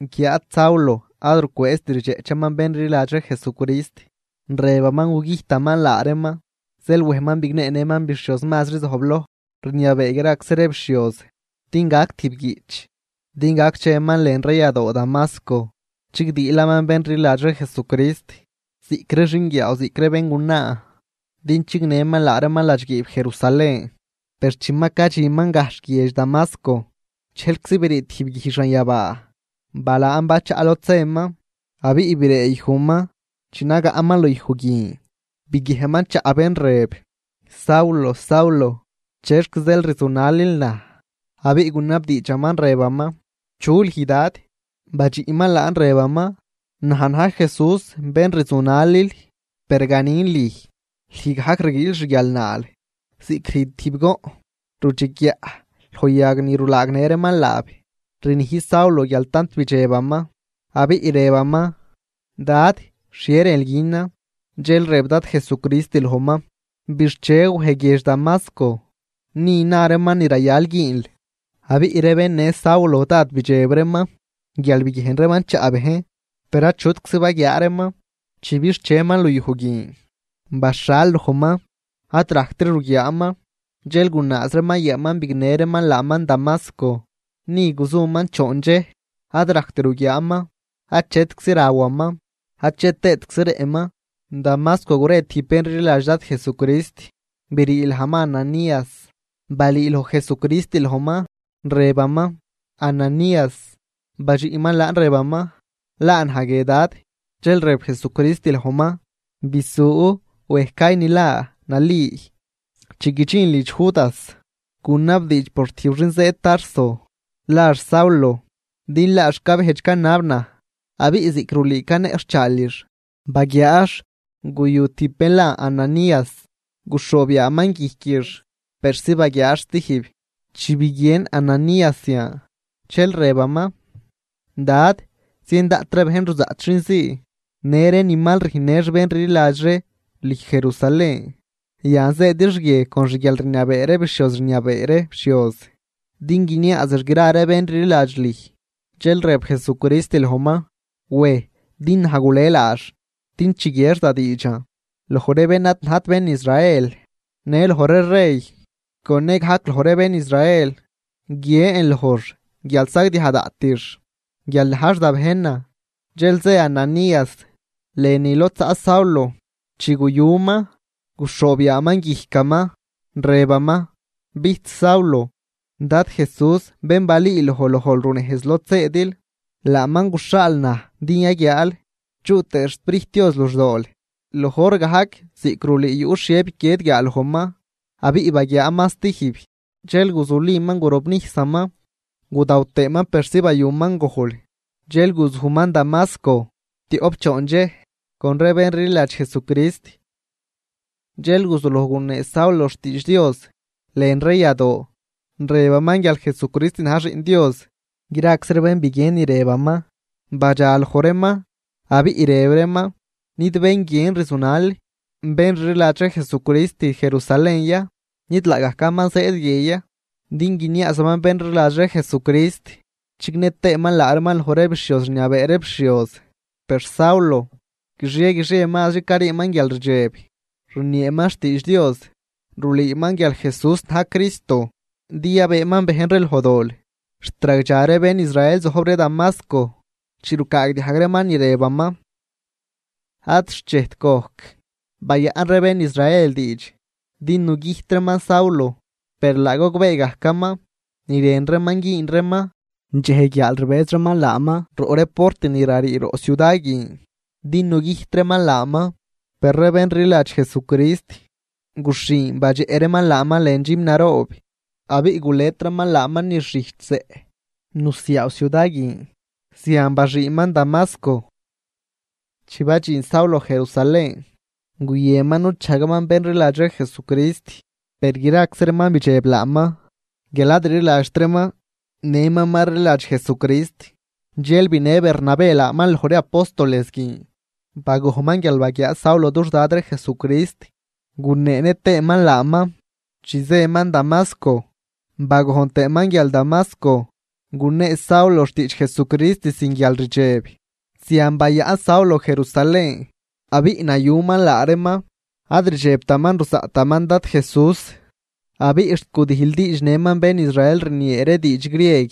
Guiáad Saulo ad rucwëëzt rdxeꞌchaman bén rliladx ree Jesucrist, rëbaman gugüjtaman laa reeman. Zeel wejman bigneenëman bixhioz mazri zojbloj rniabee graczi ree bixhioz, din gac tijb guiꞌch din gac cheman lën ree yadoo Damasco chigdiilaman bén rliladx ree Jesucrist, ziꞌc ree xinguiaaw ziꞌc ree béngunaa, din chignëman laa reeman ladxguiib Jerusalén. Per chi ma cadxinman gajxh guiedx Damasco, dxejlczi brii tijb guij xanyabaa balaan bachaꞌ lod zëman. Abiꞌ bireeyujman, chi nagaꞌman luyuj guin biguiejnman chaꞌ bén rëb: ―Saulo, Saulo, ¿chexc zeel rzunalil naj? Abiꞌ gunabdiidxaman rëbaman: ―¿Chu lüj, Dad? Badxiꞌman laan rëbaman: ―Naj na̱j Jesús bén rzunalil. Per ganin lüj, lüj gajc rguiil xguialnaal ziꞌc rüjn tijb goꞌn rudxeguiaꞌ loj yag ni rulaagnë reeman laab. Rnij Saulo guial tant bidxebaman, abiꞌ rëbaman: ―Dad, ¿xhie rënl günan? Dxel rëb Dad Jesucrist lojman: ―Bixche, wej guiedx Damasco, ni na reeman ni rayal güünl. Abiꞌ ree bén në Saulo dád bidxeb reeman guial biguiejn reeman chaꞌ bejn, per achutczi baguiaa reeman. Chi bixcheman luyuj guin, baxhal lojman, ad rajctri ruguiaaman. Dxel gunaaz reeman yaaman bignë reeman laaman Damasco. Ni guzuman choon dxej, ad rajct ruguiaaman, achetczi rawaman ache tëëtczi rëꞌman. Damasco gure tijb bén rliladx Dad Jesucrist, brii lajman Ananías. Balüüloj Jesucrist lojman, rëbaman: ―¡Ananías! Badxiꞌman laan rëbaman: ―Laa naj guie Dad. Dxel rëb Jesucrist lojman: ―Bisu, wej call ni la nali. Chi guidxinl lidx Judas, gunabdiidx por tijb xin zëëd Tarso, lax Saulo. Din laax cabejdx canab naj, abiꞌ ziꞌc rulüü caneꞌxhchaalix, baguiaax guyu tijb bén la Ananías guxhoob yaaman guijquix persi baguiaax stijb. Chi biguien Ananías zian, dxel rëbaman: ―Dad, zien daꞌt ree bejn ruzaꞌt xin zii, në ree ni mal rüjnnëx bén rliladx ree lüj Jerusalén. Yan zëëdix guie con xguialrniabee ree bixhioz rniabee ree bixhioz, din guiniaazix gra ree bén rliladx lüj. Dxel rëb Jesucrist lojman: ―Wej, din naj gule laax din chiguiex da diidxan loj ree bén ad najt bén Israel, në loj ree rey, con nëgajc loj ree bén Israel. Guiën lojx guial sagdiaj daꞌtix guial najx da bejnan. Dxel zë Ananías lënü lod zaꞌ Saulo. Chi guyuman, guxhoob yaaman guijcaman, rëbaman: ―Bijch Saulo, Dad Jesús bén balüüloj lojl runejz lod zëëdil, laaman guxhaal naj din yaguiaal, chuꞌ tëë xSprijt Dios luxdool. Loj hor gajc ziꞌc rulüü yuꞌ xhie biquied guiaalojman abiꞌ baguiaaman stijb. Dxel guzuliman gurobnijsaman, gudaw tëëman persi bayuman gojl. Dxel guzujman Damasco tioꞌp choon dxej con ree bén rliladx Jesucrist. Dxel guzuloj gunee Saulo xtiidx Dios lën ree yadoo, rëbaman guial Jesucrist na̱j Xiꞌn Dios. Graczi ree bén biguien ni rëbaman badxa loj reeman abiꞌ rëb reeman: ―¿Nid bén guien rzunal bén rliladx ree Jesucrist Jerusalén ya? ¿Nid laagajcaman zëëd guie ya, din guiniaazaman bén rliladx ree Jesucrist chignë tëëman laa reeman loj ree bixhioz rniabee ree bixhioz? Per Saulo guixie guixie mazri cariiman guialrdxeb rnieeman xtiidx Dios, rulüüman guial Jesús na̱j Cristo, din yabëëman bejn ree loj dol. Xt ragdxa ree bén Israel zojb ree Damasco chi rucaagdiajg reeman ni rëbaman. Ad xchejt gojc, bayaꞌn ree bén Israel diidx din nugüjt reeman Saulo, per laa gogbee gajcaman ni rën reeman güün reeman. Dxej guiaal rbëz reeman laaman roꞌ ree port ni rarii roꞌ ciuda guin din nugüjt reeman laaman. Per ree bén rliladx Jesucrist, guxhin badxeꞌ reeman laaman lën dxüm naroob, abiꞌ gulet reeman laaman niz xijch zeꞌ nusiaaw ciuda guin, zian baxüünman Damasco. Chi badxin Saulo Jerusalén, guyënman nuchajgaman bén rliladx ree Jesucrist, per graczi reeman bidxeb laaman guial ad rliladxt reeman nëman ma rliladx Jesucrist. Dxel binë Bernabé laaman loj ree apóstoles guin, bagojnman guial baguiaa Saulo dux Dad ree Jesucrist, guneenë tëëman laaman chi zëman Damasco, bagojn tëëman guial Damasco gunee Saulo xtiidx Jesucrist sin guialrdxeb. Zian bayaꞌn Saulo Jerusalén abiꞌ nayuman laa reeman. Ad rdxebtaman ruzaꞌtaman Dad Jesús, abiꞌ xt gudijldiidxnëman bén Israel rniee ree diidx grieg,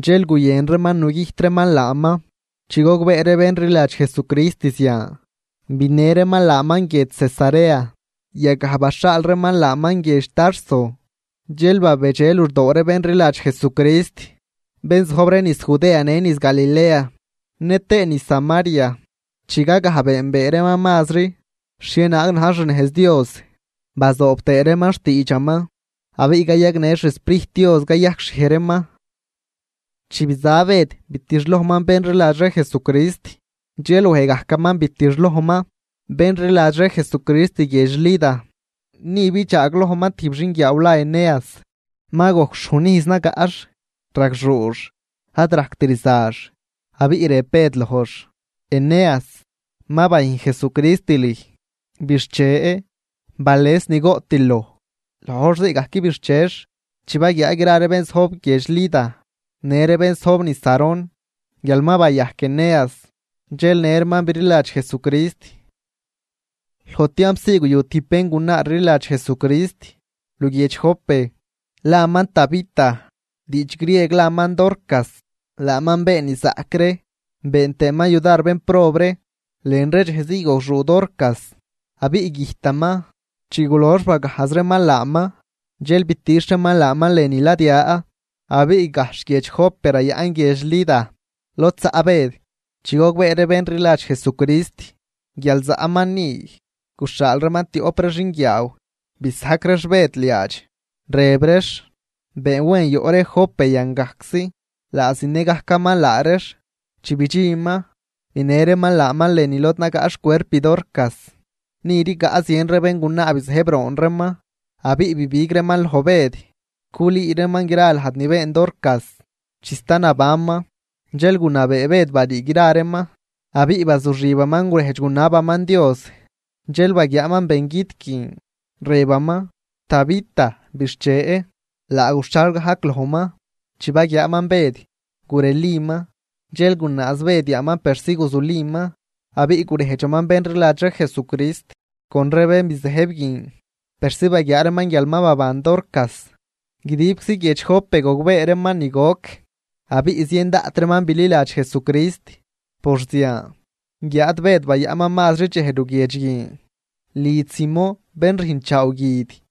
per guyën reeman nugüjt reeman laaman. Chi gogbee ree bén rliladx Jesucrist zian, binë reeman laaman guiedx Cesarea. Yagaj baxhaal reeman laaman guiedx Tarso. Dxel babedxe luxdoo ree bén rliladx Jesucrist, bén zojb ree niz Judea në niz Galilea nëtëë niz Samaria, chigagaj beenbee reeman mazri xhienaag na̱j xnejz Dios, bazoob tëë reeman xtiidxaman, abiꞌ cayagnë xSprijt Dios cayajcxhiej reeman. Chi biza Bëd bitixlojman bén rliladx ree Jesucrist, dxel wej gajcaman bitixlojman bén rliladx ree Jesucrist guiedx Lida. Ni bidxaaglojman tijb xinguiaaw la Eneas. Ma gojc xhujn ijz nagaꞌx, ragxuux, ad rajct rzax. Abiꞌ rëb Bëd lojx: ―Eneas, ma bayüjn Jesucrist lüj. Bixche, bales ni goꞌtil loj. Loj hor zii gajc bixchex. Chi baguiaa gra ree bén zojb guiedx Lida në ree bén zojb niz Sarón guial ma bayajc Eneas, dxel në reeman bililadx Jesucrist. Loj tiamp zii guyu tijb béngunaa rliladx Jesucrist luguiedx Jope, laman Tabita, diidx grieg laman Dorcas. Laaman been ni zaꞌc ree, been tëëman yudar bénprob ree. Lën ree dxej zii gogxuu Dorcas abiꞌ güjtaman. Chi gulox bagajz reeman laaman, dxel bitixh reeman laaman lënü ladya. Abiꞌ gajxh guiedx Jope rayaꞌn guiedx Lida lod zaꞌ Bëd. Chi gogbee ree bén rliladx Jesucrist guial zaꞌman ni, guxhaal reeman tioꞌp ree xinguiaaw bisajc reex Bëd liaadx, rëb reex: ―Been wen yoꞌ ree Jope yan gajczi. Laa zinë gajcaman laa reex. Chi bidxinman, binë reeman laaman lënü lod nagaꞌ xcuerp Dorcas. Ni rigaꞌ zien ree béngunaa bizëjb roon reeman, abiꞌ bibig reeman loj Bëd culüü reeman gra lajd ni been Dorcas chi sta nabanman. Dxel gunabee Bëd barii gra reeman, abiꞌ bazuxibaman gurejdx gunabaman Dios. Dxel baguiaaman bengüt guin, rëbaman: ―¡Tabita, bixche! Laa guxhal gajc lojman. Chi baguiaaman Bëd, gureliman, dxel gunaaz Bëd yaaman persi guzuliman. Abiꞌ gurejdxaman bén rliladx ree Jesucrist con ree bén bizëjb guin, persi baguiaa reeman guial ma baban Dorcas. Guidibczi guiedx Jope gogbee reeman ni goc, abiꞌ zien daꞌt reeman bililadx Jesucrist por zian. Guiáad Bëd bayaꞌnman mazri dxej luguiedx guin, lidx Simón bén rüjnchaaw guid.